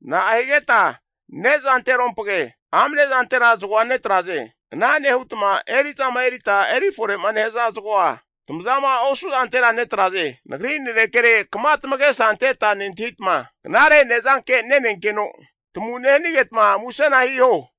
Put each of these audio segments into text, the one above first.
Na'a higeta ne'za ne'zanterompage amne zantera zagoa netraze. Ana nehutma eri'zama erita eri fore'ma nehaza zagoa tamazama osu'zantera netraze? Nagri nanekere kama tamagesa anteta nentahitma, knare nezanke nenenkeno tamu nehanigetma musena hiho.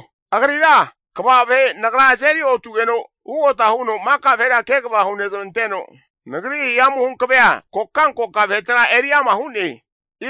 Keho, agrira kva vahe Nagra azeri otugeno ugota huno maka vahera kegava hunezmanteno Nagri hihamu hankavea kokankoka vahetera eri ama hu'ne.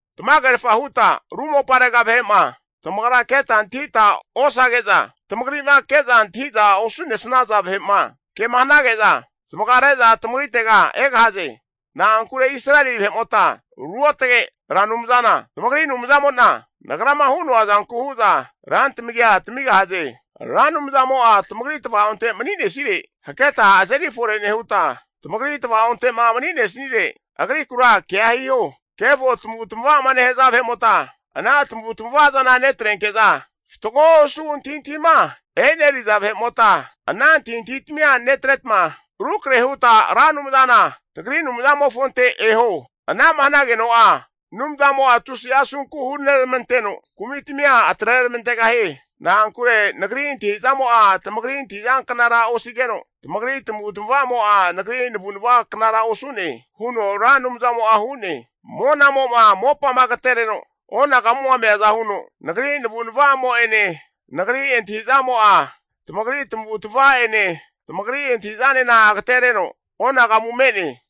Tamagerfa huta ru moparega vahe'ma tamagra keta antahita osage'za, tamagri'ma ke'za antahi'za osu'nesnaza vahe'ma ke'ma hanage'za zamagare'za tamagritega egahaze. Na'ankure Israeli vahe'mota ruotage Ra Anumzana tamagri Anumzamo'na, Nagrama hu'noa zanku hu'za rantamagia tamigahaze. Ra Anumzamo'a tamagri tva'onte mani'nesire, haketa azeri fore nehuta, tamagri tva'onte'ma mani'nesire, agrikura kea hiho. Kefo tamavu tamava'ma nehaza vahe'mota ana tamavu tamava'zana netrenke'za, fatgo osu antahintahima e'neri'za vahe'mota ana antahintahitamia netretma rukrahe huta Ra Anumzana tagri Anumzamofonte eho. Ana'ma hanageno'a Anumzamo'a tusi'a asunku huneramanteno kumitamia atreramantegahie. Na'ankure Nagri antahi'zamo'a tamagri antahizanknara osigeno, tamagri tamavu tamavamo'a, Nagri navu'nava knara osu'ne huno Ra Anumzamo'a hu'ne. Monamo'ma mopama agatereno onagamuma meaza huno, Nagri navunavamo'ene Nagri antahizamo'a, tamagri tamavu tamava'ene tamagri antahi'zanena agatereno onagamu me'ne.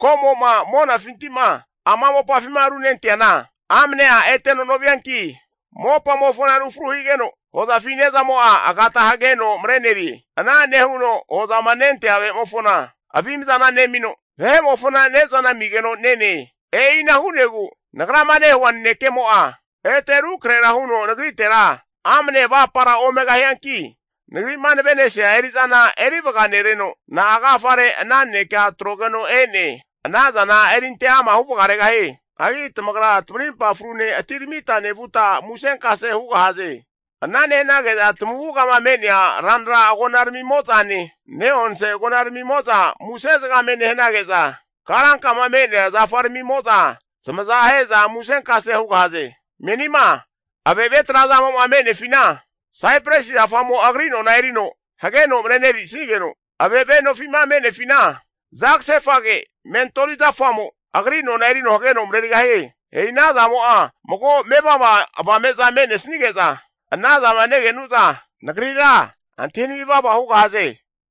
Ko'mo'ma monafinti'ma ama mopafima runenteana, amnea eteno novianki, mopamofona rufru higeno, hozafi ne'zamo'a agata hageno marenerie. Ana nehuno hu'zama nentea vahe'mofona avimzana nemino, vahe'mofona ne'zana amigeno nene. E'ina hu'negu Nagrama nehua nanekemo'a, ete rukrahera huno Nagritera amne avapara omegahianki, Nagri'ma navesi'nea eri'zana erivaga nereno, na'a agafare ana nanekea atrogeno e'ne, anazana erinte ama huvagaregahie. Hagi tamagra tamarimpa frune atiramita nevuta musenkase hugahaze. Ana nehanage'za tamavugama me'nea ranra agona ramimo'zane, ne'onse agonaramimo'za muse zagame nehanage'za, karankama me'nea zafaramimo'za zamaza ahe'za musenkase hugahaze. Menima ave'ave trazamo'ma me'nefina, saipresi zafamo agri nona erino hageno marenerisigeno, ave'ave nofi'ma me'nefina, zagasefage mentoli zafamo agri nona erino hageno marerigahie. E'i ana zamo'a mago mevava avame'za me'nesnige'za, ana zama nege'nu'za Nagrira antahinami vava hugahaze.